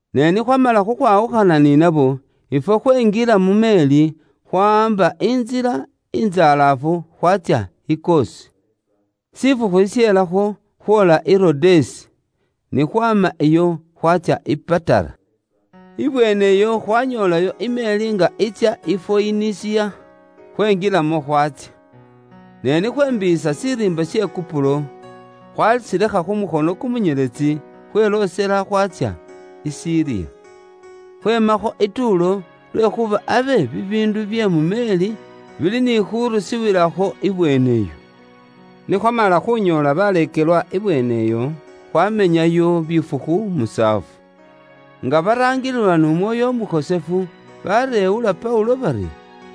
Ne ni khwamala khukhwawukhana ni nabo, ifwe khwenjila mu meeri, khwawaamba intsila intsalaafu khwatsya i Kosi. Shifukhu shishelakho khwoola i Rodesi. Ni khwaama iyo khwaatsya i Patara. Ibweene iyo khwanyoolayo i meeri nga itsya i Foyinisiya, khwenjilamo khwaatsya. Ne ni khwembiiyisa shiriimba she Kupuro, khwashilekha khu mukhono kumunyeletsi, khweloosela khwatsya i Siriya, khweemakho i Tuulo lwekhuuba abe bibiindu bye mu meeri bili ni khurusiwilakho ibweene iyo. Ni khwamala khunyoola baleekelwa ibweene iyo, khwamenyayo bifukhu musaafu. Nga baraangililwa n'Umwoyo Umukhosefu, bareewula Paulo bari,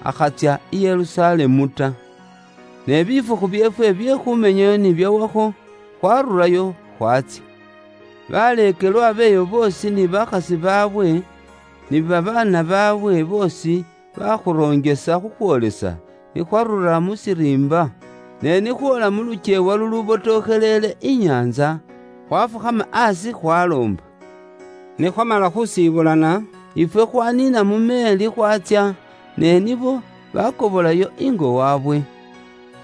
akhatsya i Yerusalemu ta. Ne bifukhu byeefwe bye khumenyayo ni byawakho, khwarurayo khwaatsya. Baleekelwa b'eyo boosi ni bakhasi baabwe, ni babaana baabwe boosi bakhuroonjesa khukhwoolesa ni khwarura mu shiriimba. Ne ni khwoola mu lukyeewa lulubotokhelele inyaantsa, khwafukhama aasi khwaloomba Ni khwamala khuusibulana, ifwe khwaniina mu meeri khwaatsya, ne nibo baakobolayo ingo waabwe.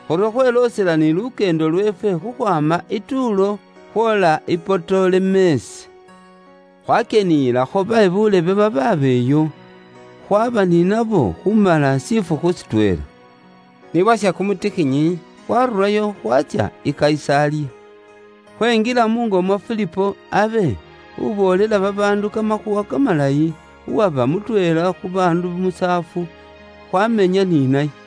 Khuryo khweloosela ni lukyeendo lweefwe khukhwaama i Tuulo khwoola i Potolemesi. Khwakyeniyilakho be buulebe babaaba iyo, khwaba ni nabo khumala shifukhu shitweela. Ni bwasha kumutikhinyi, khwaarurayo, khwatsya i Kayisaliya. Khwenjila muungo mwa Filipo, abe uboolela babaandu Kamakhuuwa Kamalayi, uwaba mutweela khu baandu musaafu, khwamenya ni naye.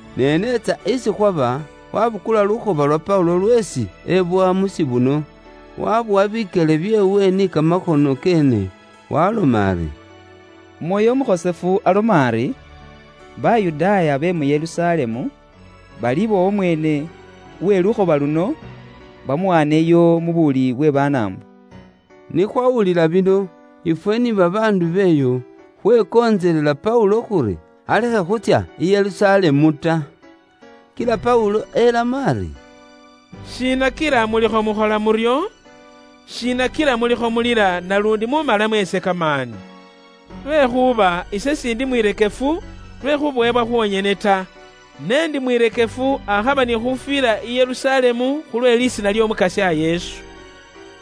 Ne n'etsa isi khwaba, waabukula lukhoba lwa Paulo lweesi ebowa mu shikuute, wabowa bikyele byeewe ni kamakhono keene, waaloma ari, “Umwoyo Umukhosefu aloma ari, ‘Bayudaaya be mu Yerusalemu balibowa umweene uwe lukhoba luno, bamuwaaneyo mu buwuli bwe Banaambo.’” Ni khwawulila bino, ifwe ni babaandu b'eyo, khwekontselela Paulo khuri alekhe khuutsya i Yerusalemu ta. Kila Paulo elamo ari, “Shiina kila mulikho mukhola muryo? Shiina kila mulikho mulila naluundi muumalamo ise kamaani mu mwoyo? Lwekhuuba ise siindi mwirekefu lwe khubowebwa khwonyene ta, ne indi mwirekefu akhaba ni khufwila i Yerusalemu khulwe lisiina ly'Omukasya Yesu.”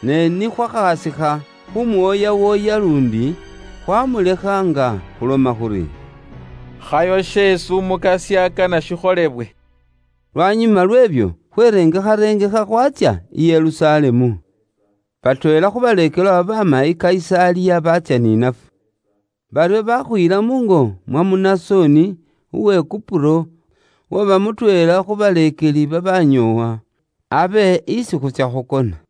Ne ni khwakhasikha khumuwooyawooya luundi, khwaamulekha nga khuloma khuri, “Khayo sheesi Umukasya akana shikholebwe.” Lwanyuma lweebyo, khwerengekharengekha khwatsya i Yerusalemu. Batweela khu baleekelwa babaama i Kayisaliya baatsya ni nafwe. Baryo bakhuyila muungo mwa Munasoni, uwe Kupuro, uwaba mutweela khu baleekeli babanyoowa, abe isi khuutsya khukona.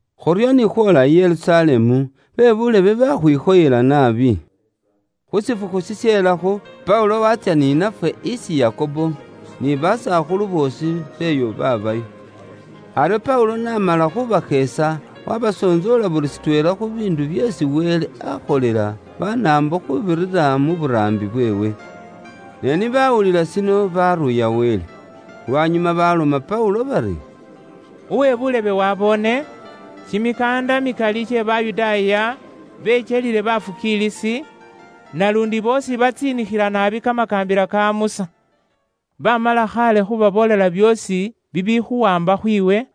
Khuryo ni khwoola i Yerusalemu, be buulebe bakhwikhoyela naabi. Khu shifukhu shishelakho, Paulo watsya ni nafwe isi Yakobo, ni basakhulu boosi b'eyo babaayo. Aryo Paulo n'amala khubasheesa, wabasontsoola buli shitweela khu biindu byeesi Wele akholela Banaambo khuubirira mu buraambi bweewe. Ne ni baawulila shino, baaruuya Wele. Lwanyuma baalomela Paulo bari, “Uwe buulebe waboone, kimikaanda mikali kye Bayudaaya bekyelile bafukiilisi, naluundi boosi batsiinikhila naabi kamakaambila ka Musa. Bamala khaale khubaboolela byoosi bibikhuwaamba khwiiwe,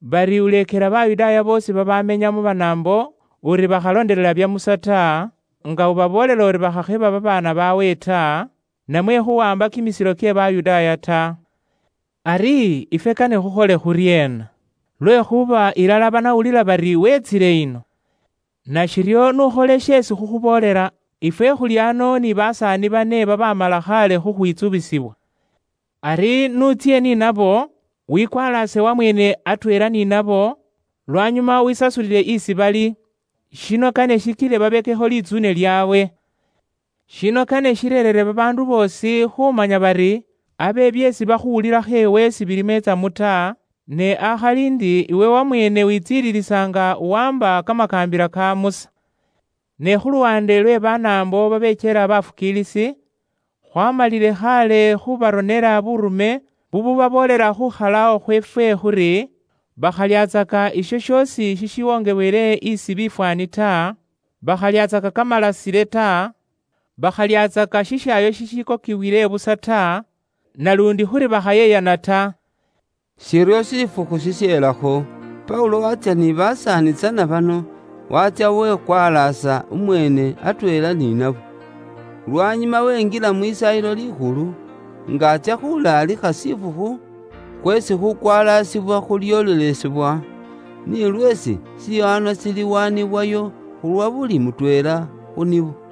bari uleekela Bayudaaya boosi babamenya mu Banaambo uri bakhalondelela bya Musa ta, nga ubaboolela uri bakhakheba babaana baabwe ta, namwe khuwaamba kimisilo kye Bayudaaya ta. Ari, ifwe kane khukhole khuryeena? Lwekhuuba ilala banawulila bari weetsile ino. Nashiryo n'ukhole sheesi khukhuboolela. Ifwe khuli ano ni basaani bane babaamala khaale khukhwitsubisibwa. Ari n'utsye ni nabo, wipyeluuse wamweene atweela ni nabo, lwanyuma wisasulile isi bali. Shino kane shikile babekekho litsuune lyaabwe. Shino kane shireerere babaandu boosi khumanya bari abe byeesi bakhuwulilakho iwe sibilimo itsamu ta, ne akhali ndi iwe wamweene witsiililisa nga uwaamba kamakaambila ka Musa. Ne khu luwaande lwe Banaambo babekyela bafukiilisi, khwaamalile khaale khubaronela buurume bububaboolela khukhalawo khweefwe khuri, bakhalyatsaka isho shoosi sheesi bawongeele bifwaani ta, bakhalyatsaka kamalasile ta, bakhalyatsaka shishaayo sheesi bakokile busa ta, naluundi khuri bakhakhola buyeyani ta.” Shiryo shifukhu shishelakho, Paulo waatsya ni basaani tsana bano, waatsya wepyeluusa umweene atweela ni nabo. Lwanyuma wenjila mu Lisaayilo Likhulu, nga atsya khulaalikha shifukhu khweesi khukwalaasibwa khulyoolelesebwa, ni lweesi shiwaanwa shiliwaanibwayo khu lwa buli mutweela khu nibo.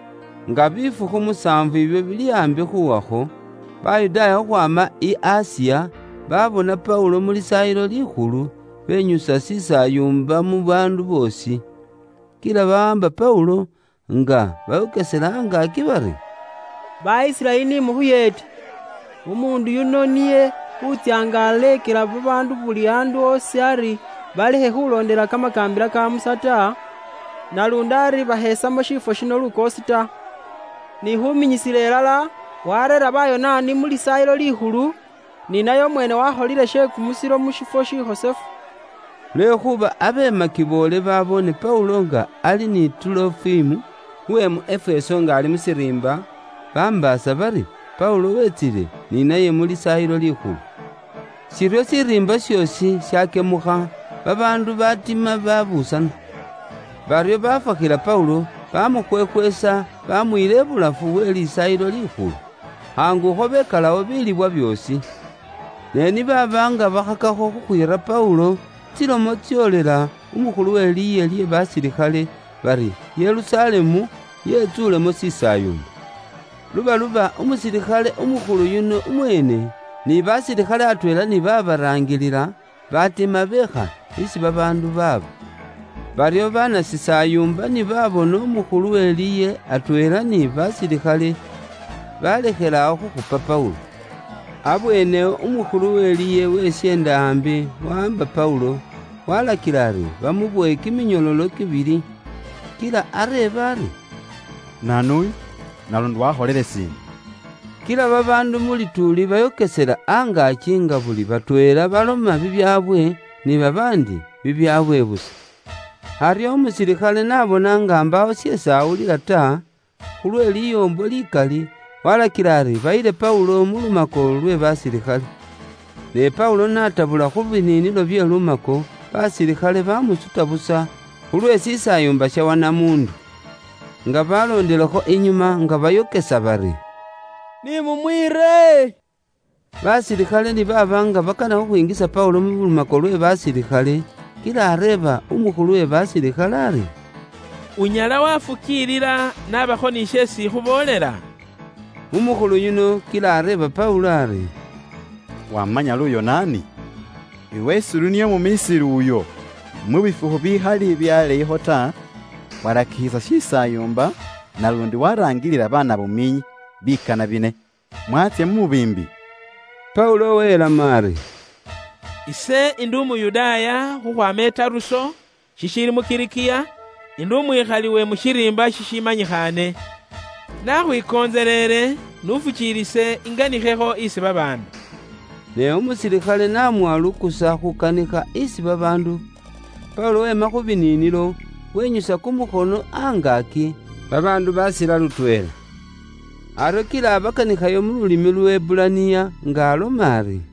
Nga bifukhu musaafu ibyo bili aambi khuwakho, Bayudaaya khukhwaama i Asiya, baabona Paulo mu Lisaayilo Likhulu, benyusa shisaayumba mu baandu boosi. Kila bawaamba Paulo, nga bayokesela angaaki bari, “Ba Isiraeli ni mukhuyeete. Umuundu yuno niye wutsya nga aleekela babaandu buli andu osi ari balekhe khulondelela kamakaambila ka Musa ta, naluundi ari bakhesamo lukoosi shiifwo shino ta. Ni khuminyisila ilala, wareera Bayonaani mu Lisaayilo Likhulu, ni naye umweene wakholile she kumusilo mu shifwo shikhosefu.” Lwekhuuba abe makiboole baboone Paulo nga ali ni Tuulofimu uwe mu Efeso nga ali mu shiriimba, bambaasa bari Paulo wetsile ni naye mu Lisaayilo Likhulu. Shiryo shiriimba shoosi shakyemukha, babaandu baatima babuusana. Baryo bafwaakhila Paulo, baamukhwekhweesa baamuyila ibulafu we Lisaayilo Likhulu. Khaangukho bekalawo bilibwa byoosi. Ne ni baaba nga bakhakakho khukhwiira Paulo, tsilomo tsyoolela umukhulu we liye lye basilikhale, bari Yerusalemu yetsuulemo shisaayumba. Lubaluba umusilikhale umukhulu yuno umweene, ni basilikhale atweela ni babaraangilila, batima beekha isi babaandu baaba. Baryo banashisaayumba ni babona umukhulu we liye atweela ni basilikhale, balekhelawo khukhupa Paulo. Abweene awo umukhulu we liye wesyeenda aambi wawaamba Paulo, waalakila ari bamubowe kiminyololo kibili. Kila areeba ari “Naanu uyu, naluundi wakholile shiina?” Kila babaandu mu lituuli bayokesela angaaki nga buli batweela baloma bibyaabwe, ni babaandi bibyaabwe busa. Aryo umusilikhale n'abona nga s'anyala wekura bulayi byeesi balikho baloma ta khu lwe liyoombo likali, walakila ari bayile Paulo mu lumako lwe basilikhale. Ne Paulo n'aatabula khu biniinilo bye lumako, basilikhale bamusuta busa khu lwe shisaayumba sha wanamuundu. Nga baloondilekho inyuma, nga bayokesa bari, “Ni mumwiire!” Basilikhale ni baaba nga bakana khukhwinjisa Paulo mu lumako lwe basilikhale, kila areeba umukhulu we basilikhale ari, “Unyala wafukiilila nabakho ni sheesi ikhuboolela?” Umukhulu yuno kila areeba Paulo ari, “Wamanya Luyonaani? Iwe s'uli niye umu Misiri uyo, mu bifukhu bibikhali bye aleeyikho ta, uwarakikhisa shisaayumba naluundi waraangilila banabumiinyi bikana bine, mwatsya mu mubiimbi?” Paulo welamo ari, “Ise indi Umuyudaaya, khukhwaama i Taruso, shishiili mu Kilikiya, indi umwikhali we mu shiriimba shishimanyikhaane. Nakhwikontseleele, n'ufukiilise inganikhekho isi babaandu.” Ne umusilikhale n'amuwa lukusa khuukanikha isi babaandu, Paulo weema khu biniinilo, wenyusa kumukhono angaaki, babaandu baasila lutweela. Aryo kila abakanikhayo mu lulimi Luheburaniya, nga aloma ari: